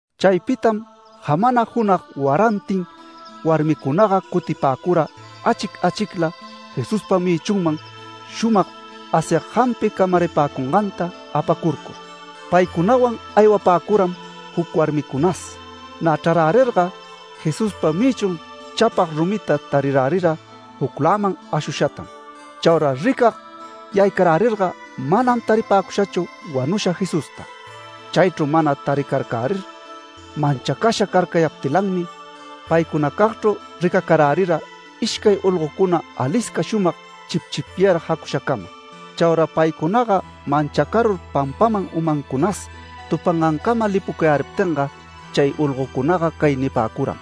Chaypitam jamana junag warantin warmicunaga cutipäcura achic achicla Jesuspa mïchunman shumag asyag jampi camaripäcunganta apacurcur. Paycunawan aywapäcuram juc warmicunas. Nä chrarärirga, Jesuspa mïchun chapag rumita tarirärira jucläman ashushatam. Chaura ricag yaycarärirga manam taripäcushachu wanusha Jesusta. Chaychru mana taricarcärir manchacasha carcayaptilanmi, paycunacagchru ricacarärira ishcay olgocuna alisca shumag chipchipyar jacushacama. Chaura paycunaga manchacarur pampaman umancunas tupangancama lipucayäriptinga, chay olgocunaga cay nipäcuram: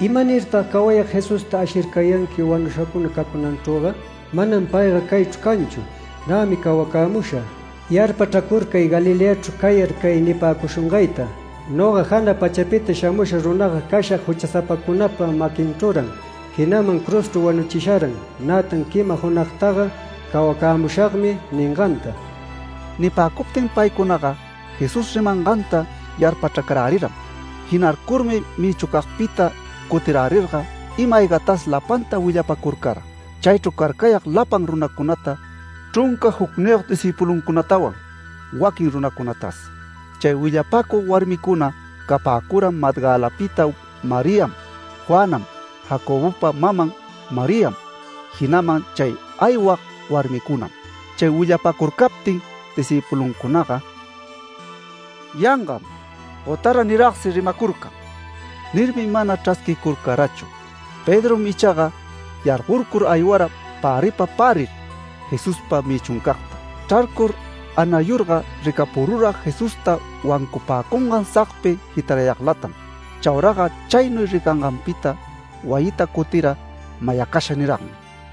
“¿Imanirtag cawayag Jesusta ashircayanqui wanushacuna cacunanchrüga? ¡Manam payga caychru canchu! Nämi cawacämusha. Yarpachracurcay Galileachru cayar, cay nipäcushungayta: ‘Noga jana pachapita shamusha runaga cashag juchasapacunapa maquinchrüran, jinaman cruzchru wanuchisharan, nätan quima junagtaga cawacämushagmi’ ninganta”. Nipäcuptin paycunaga Jesús rimanganta yarpachracaräriram. Jinarcurmi mïchucagpita cutirärirga, ima-aygatas lapanta willapacurcara, chaychru carcayag lapan runacunata, chrunca jucniyog discïpuluncunatawan waquin runacunatas. Chay willapäcug warmicuna capäcura Magdalapita Mariam, Juanam, Jacobopa maman Mariam, jinaman chay aywag warmicunam. Chay willapacurcaptin discïpuluncunaga “Yangam, gotara niragsi rimacurcan” nirmi mana chrasquicurcarachu. Pedrom ichaga yargorcur aywara päripa pärir Jesuspa mïchuncagta. Chrarcur anayurga, ricapurura Jesusta wancupäcungan sagpi jitarayaglatam. Chauraga chaynuy ricanganpita wayita cutira mayacasha niragmi.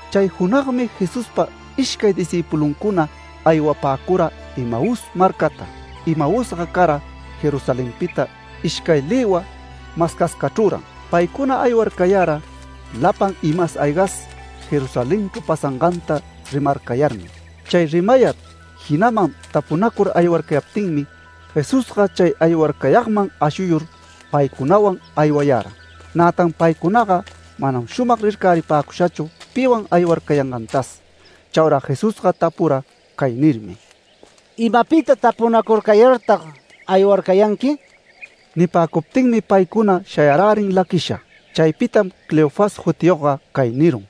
Chay junagmi Jesuspa ishcay discïpuluncuna aywapäcura Emaús marcata. Emausga cara Jerusalenpita ishcay lïwa mascascachrüran. Paycuna aywarcayara lapan imas aygas Jerusalenchru pasanganta rimarcayarmi. Chay rimayar jinaman tapunacur aywarcayaptinmi, Jesusga chay aywarcayagman ashuyur paycunawan aywayara. Nätan paycunaga manam shumag rircaripäcushachu piwan aywarcayangantas. Chaura Jesusga tapura cay nirmi: “¿Imapita tapunacurcayartag aywarcayanqui?” Nipäcuptinmi paycuna shayarärin laquisha. Chaypitam Cleofas jutiyogga cay nirun: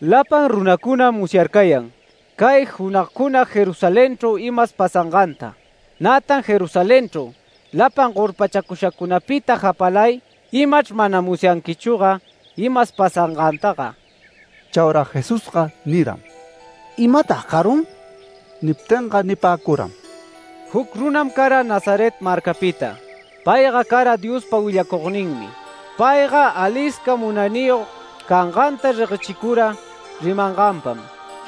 “Lapan runacunam musyarcayan cay junagcuna Jerusalenchru imas pasanganta. Nätan Jerusalenchru lapan gorpachacushacunapita japalay imachr mana musyanquichüga imas pasangantaga”. Chaura Jesusga niram: “¿Imatag carun?” Niptinga nipäcuram: “Juc runam cara Nazaret marcapita. Payga cara Diospa willacugninmi. Payga alisca munayniyog canganta reguechicura rimanganpam,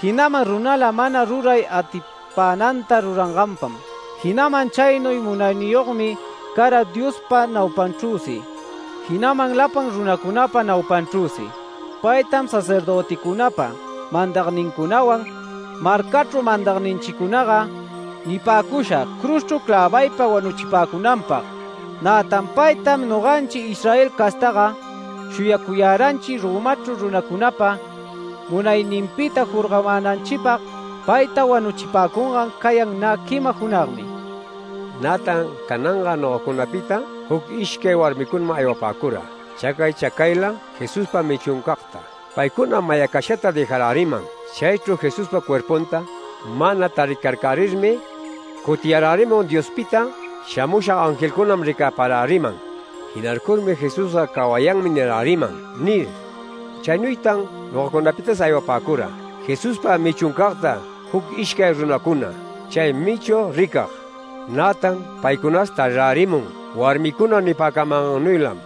jinaman runala mana ruray atipänanta ruranganpam. Jinaman chaynuy munayniyogmi cara Diospa naupanchrüsi, jinaman lapan runacunapa naupanchrüsi. Paytam sacerdöticunapa mandagnincunawan marcachru mandagninchicunaga nipäcusha cruzchru clävaypa wanuchipäcunanpag. Nätan paytam noganchi Israel castaga shuyacuyaranchi Romachru runacunapa munayninpita jorgamänanchipag. Payta wanuchipäcungan cayan nä quima junagmi. Nätan cananga nogacunapita juc ishcay warmicunam aywapäcura chacay chacayla Jesuspa mïchuncagta. Paycunam mayacashata dëjaräriman. Chaychru Jesuspa cuerpunta mana taricarcärirmi, cutiyarärimun Diospita shamusha angelcunam ricäparäriman. Jinarcurmi ‘Jesusga cawayanmi niräriman’ nir. Chaynuytan nogacunapitas aywapäcura Jesuspa mïchuncagta juc ishcay runacuna chay mïchu ricag. Nätan paycunas tarirärimun warmicuna nipäcamangannuylam”.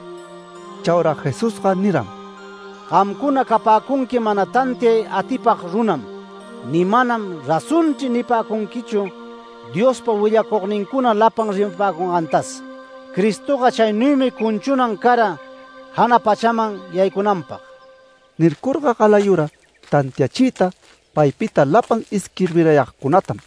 Chaura Jesusga niram: “Gamcuna capäcunqui mana tantiay atipag runam ni ‘Manam razonchri’ nipäcunquichu, Diospa willacugnincuna lapan rimapäcungantas. Cristoga chaynuymi cunchunan cara jana pachaman yaycunanpag”. Nircurga galayura tantiachiyta paypita lapan isquirbirayagcunatam,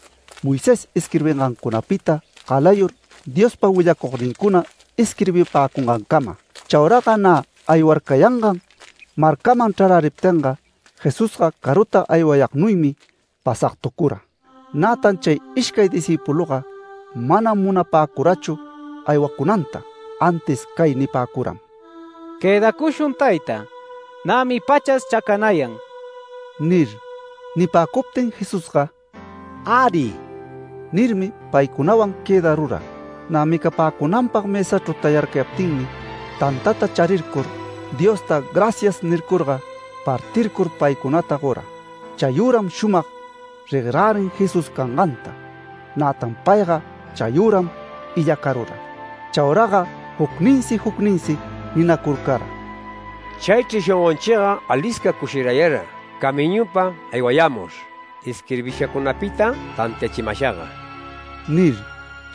Moisés isquirbingancunapita galayur Diospa willacugnincuna isquirbipäcungancama. Chauraga nä aywarcayangan marcaman chraräriptinga, Jesusga caruta aywayagnuymi pasagtucura. Nätan chay ishcay discïpuluga manam munapäcurachu aywacunanta, antis cay nipäcuram: “Quëdacushun tayta. Nämi pachas chacanayan” nir. Nipäcuptin Jesusga “Äri” nirmi paycunawan quëdarura. Nä micapäcunanpag mësachru tayarcayaptinmi, tantanta charircur, Diosta “Gracias” nircurga partircur paycunata gora. Chayüram, shumag reguerärin Jesús canganta, nätan payga chayüram illacarura. Chauraga jucninsi jucninsi ninacurcara: “Chaychri shongonchiga alisca cushirayara camiñupa aywayämur isquirbishacunapita tantiachimashaga” nir.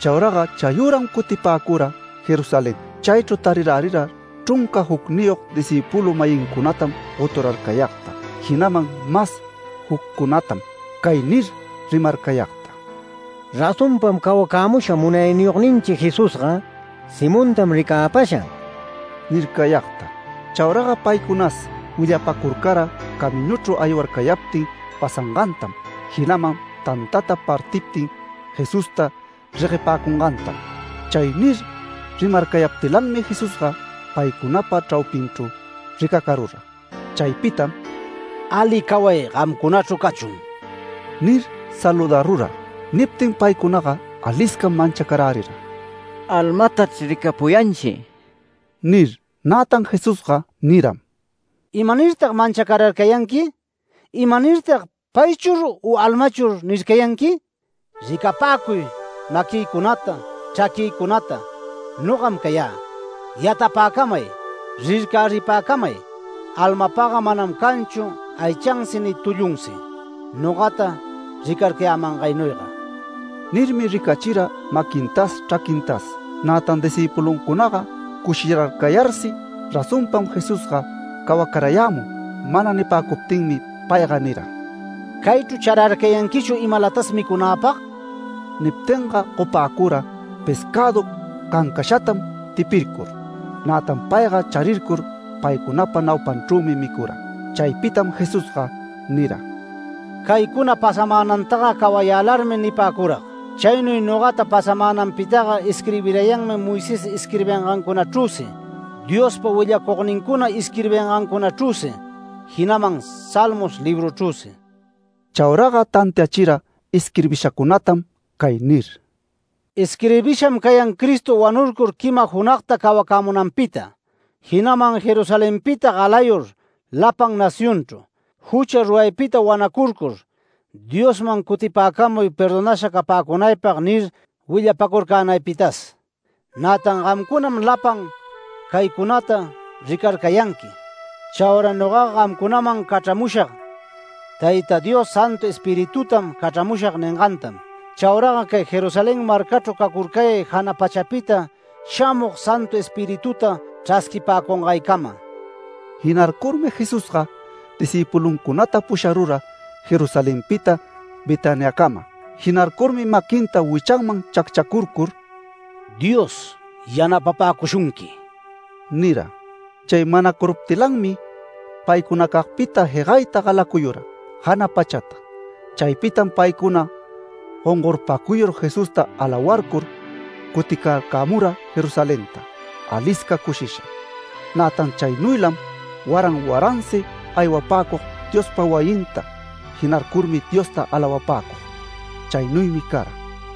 Chauraga chayüram cutipäcura Jerusalenta. Chaychru tarirärira chrunca jucniyog discïpulu-mayincunatam goturarcayagta jinaman mas juccunatam cay nir rimarcayagta: “Razonpam cawacämusha Munayniyogninchi Jesusga. Simontam ricäpasha” nircayagta. Chauraga paycunas willapacurcara camiñuchru aywarcayaptin pasangantam jinaman tantata partiptin, Jesusta reguepäcungantam. Chay nir rimarcayaptilanmi Jesusga paycunapa chraupinchru ricacarura. Chaypitam “Ali caway gamcunachru cachun” nir saludarura. Niptin paycunaga aliscam manchacarärira “Almatachr ricapuyanchi” nir. Nätan Jesusga niram: “¿Imanirtag manchacararcayanqui? ¿Imanirtag ‘Paychur u almachur’ nircayanqui? Ricapäcuy maquïcunata, chraquïcunata. Nogam cayä. Yatapapäcamay. Rircaripäcamay. Almapaga manam canchu aychansi ni tullunsi nogata ricarcayämangaynuyga”. Nirmi ricachira maquintas, chraquintas. Nätan discïpuluncunaga cushirarcayarsi, razonpam Jesusga cawacarayämun mana nipäcuptinmi payga nira: “¿Caychru chararcayanquichu imalatas micunäpag?” Niptinga gopäcura pescädu cancashatam tipircur. Nätan payga charircur paycunapa naupanchrümi micura. Chaypitam Jesusga nira: “Caycuna pasamänantaga cawayälarmi nipäcürag. Chaynuy nogata pasamänanpitaga isquirbirayanmi Moisés isquirbingancunachrüsi, Diospa willacugnincuna isquirbingancunachrüsi, jinaman Salmos libruchrüsi”. Chauraga tantiachira isquirbishacunatam cay nir: “Isquirbisham cayan Cristo wanurcur quima junagta cawacämunanpita. Jinaman Jerusalenpita galayur lapan nacionchru: ‘Jucha ruraypita wanacurcur, Diosman cutipäcamuy perdonasha capäcunaypag’ nir willapacurcänaypitas. Nätan gamcunam lapan caycunata ricarcayanqui. Chaura nogaga gamcunaman cachramushag Tayta Dios ‘Santu Espiritutam cachramushag’ ningantam. Chauraga cay Jerusalén marcachru cacurcayay jana pachapita shamug Santu Espirituta chrasquipäcungaycama”. Jinarcurmi Jesusga discïpuluncunata pusharura Jerusalenpita Betaniacama. Jinarcurmi maquinta wichanman chacchacurcur “Dios yanapapäcushunqui” nira. Chay manacuruptilanmi paycunacagpita jegayta galacuyura jana pachata. Chaypitam paycuna gongorpacuyur Jesusta alawarcur cuticarcämura Jerusalenta alisca cushisha. Nätan chaynuylam waran waransi aywapäcug Diospa wayinta jinarcurmi Diosta alawapäcug. Chaynuymi cara.